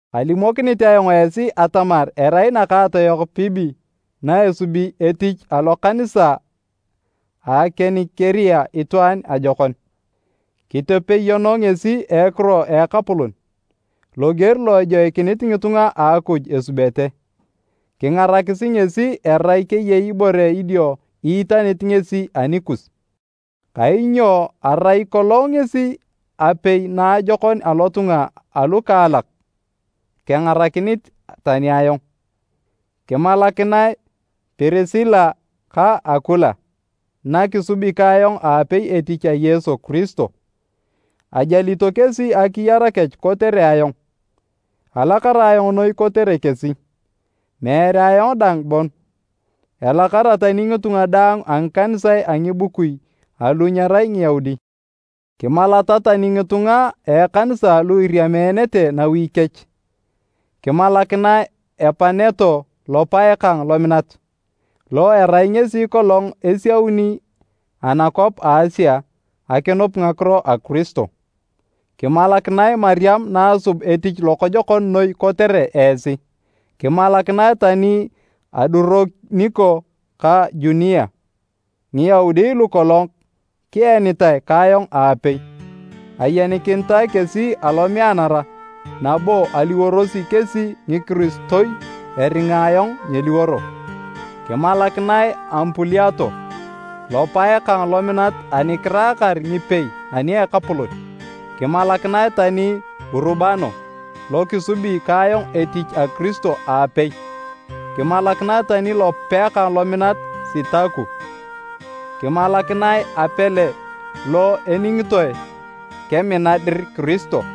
Kalimokinit ayong esi atamar erai nakaatoyok Poebe na esubi etich alokanisa a Kenikirea itwaan ajokon. Kitepeyono ngesi a ekiro a Ekapolon, loger lo ejoikinit ngitunga a Akuj esubete, kingarakisi ngesi erai keyei ibore idio iitanit ngesi anikus, kainyo arai kolong ngesi apae naajokon alotunga alukaalak kengarakinit tani ayong. Kimalakinae Pirisila ka Akula, na kisubi ka ayong aapei etich a Yesu Kiristo, ajalito kesi akiyar kech kotere ayong. Alakara ayong noi kotere kesi, meere ayong dang bon, elakara tani ngitunga daang a ngikanisae a ngibukui alu nyerai Ngiyaudi. Kimalata tani ngitunga a ekanisa lu iriameenete nawi kech. Kimalakinae Epaneto lopae kang lominat, lo erai ngesi kolong esiauni anakwap a Asia akinup ngakiro a Kiristo. Kimalakinae Mariam naasub etich lokojokon noi kotere esi. Kimalakinae tani Aduroniko ka Junia, Ngiyaudi lukolong kienitae ka ayong aapei. Ayenikinitae kesi alomeanara, nabo aliworosi kesi ngikiristoi eringa ayong nyeliworo. Kimalakinae Ampuliato, lopae kang lominat ani kiraakar ngipei ani a Ekapolon. Kimalakinae tani Urubano, lo kisubi ka ayong etich a Kiristo aapei, kimalakinae tani lopae kang lominat Sitaku. Kimalakinae Apele lo eningitoe kemina dir Kiristo.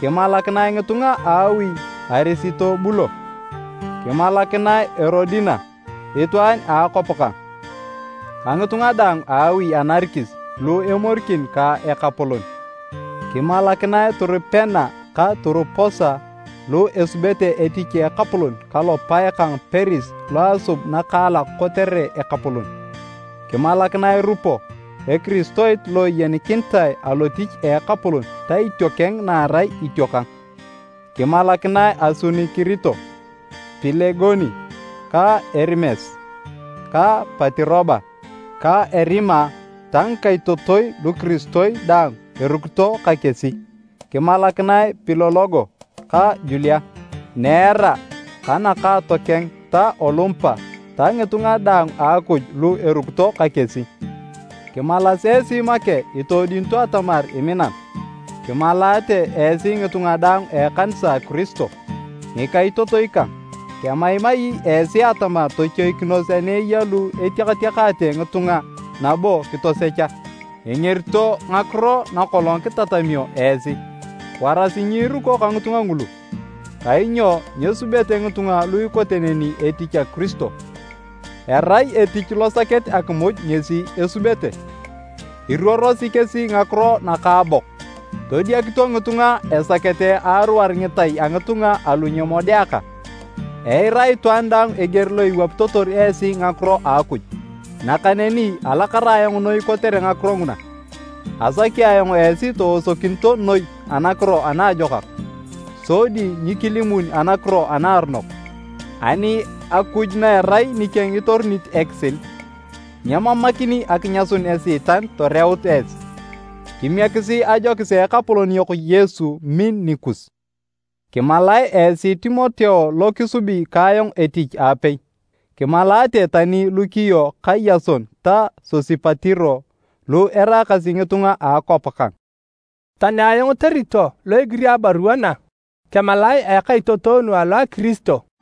Kimalakinae ngitunga a awi a Arisitobulo. Kimalakinae Erodina, itwaan a akwap kang, ka ngitunga daang a awi a Narikis lu emorikin ka Ekapolon. Kimalakinae Turupena ka Turuposa lu esubete etich a Ekapolon ka lopae kang Peris lo asub nakaalak kotere Ekapolon. Kimalakinae Rupo, ekiristoit lo eyenikinitae alotich a Ekapolon ka itiokeng na erai itiokang. Kimalakinae Asunikirito, Pilegoni, ka Erimes, ka Patiroba, ka Erima ta ngikaitotoi lukiristoi daang erukito ka kesi. Kimalakinae Pilologo ka Julia, Neera ka nakaatokeng ta Olumpa ta ngitunga daang a Akuj lu erukito ka kesi. Kimalas esi make itoodiunito atamar iminan. Kimalaate esi ngitunga daang a ekanisa a Kiristo. Ngikaitotoi kang, kemaimai esi atamar tochoikinos ani eya lu etiakatiakaate ngitunga nabo kitosecha, engerito ngakiro nakolong kitatamio esi. Warasi nyiruko ka ngitunga ngulu. Kainyo nyesubete ngitunga lu ikote neni etich a Kiristo, erai etich losaket akimuj ngesi esubete. Iruorosi kesi ngakiro nakaabok, todiakito ngitunga esakete aaruar ngitai a ngitunga alu nyemodeaka! Eira itwaan daang eger lo iwapitotor esi ngakiro a Akuj, nakaneni alakara ayong noi kotere ngakiro nguna. Asaki ayong esi toosokioto noi anakiro anaajokak, sodi nyikilimun anakiro anaaronok. Ani Akuj na erai nikeng itorunit ekisil, nyemamakini akinyasun Esiitan toreut esi. Kimiekisi ajokis a Ekapolon yok Yesu min nikus. Kimalae esi Timoteo lo kisubi ka ayong etich aapei, kimalaate tani Lukio ka Yason ta Sosipatiro lu eraakasi ngitunga a akwap kang. Tani ayong Teritio lo egiri abarua na, kemalae a ekaitotonu alo a Kiristo.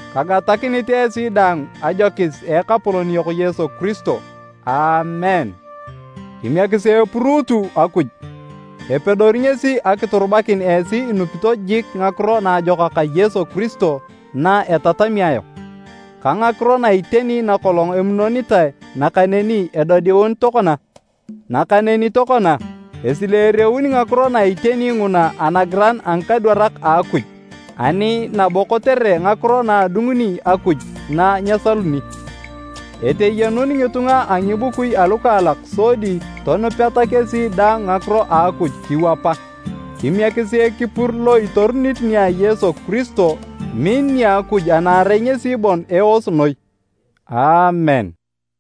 Kagatakinit esi daang ajokis a Ekapolon yok Yesu Kiristo. Aamen.] Kimiekisi epuruutu Akuj! Epedori ngesi akiturubakin esi inupito jik Ngakiro Naajokak a Yesu Kiristo na etatami ayong, ka ngakiro na iteni nakolong emunonitae nakaneni edodiun tokona. Nakaneni tokona, esileereun ngakiro na iteni nguna anagiran a ngikadwarak a Akuj ani nabo kotere ngakiro na adunguni Akuj na nyesaluni, eteyenun ngitunga a ngibukui alukaalak sodi tonupeta kesi daang ngakiro a Akuj kiwapa. Kimiekisi ekipur lo itorunit nia Yesu Kristo, min nia Akuj ana erai ngesi bon eos noi! Aamen.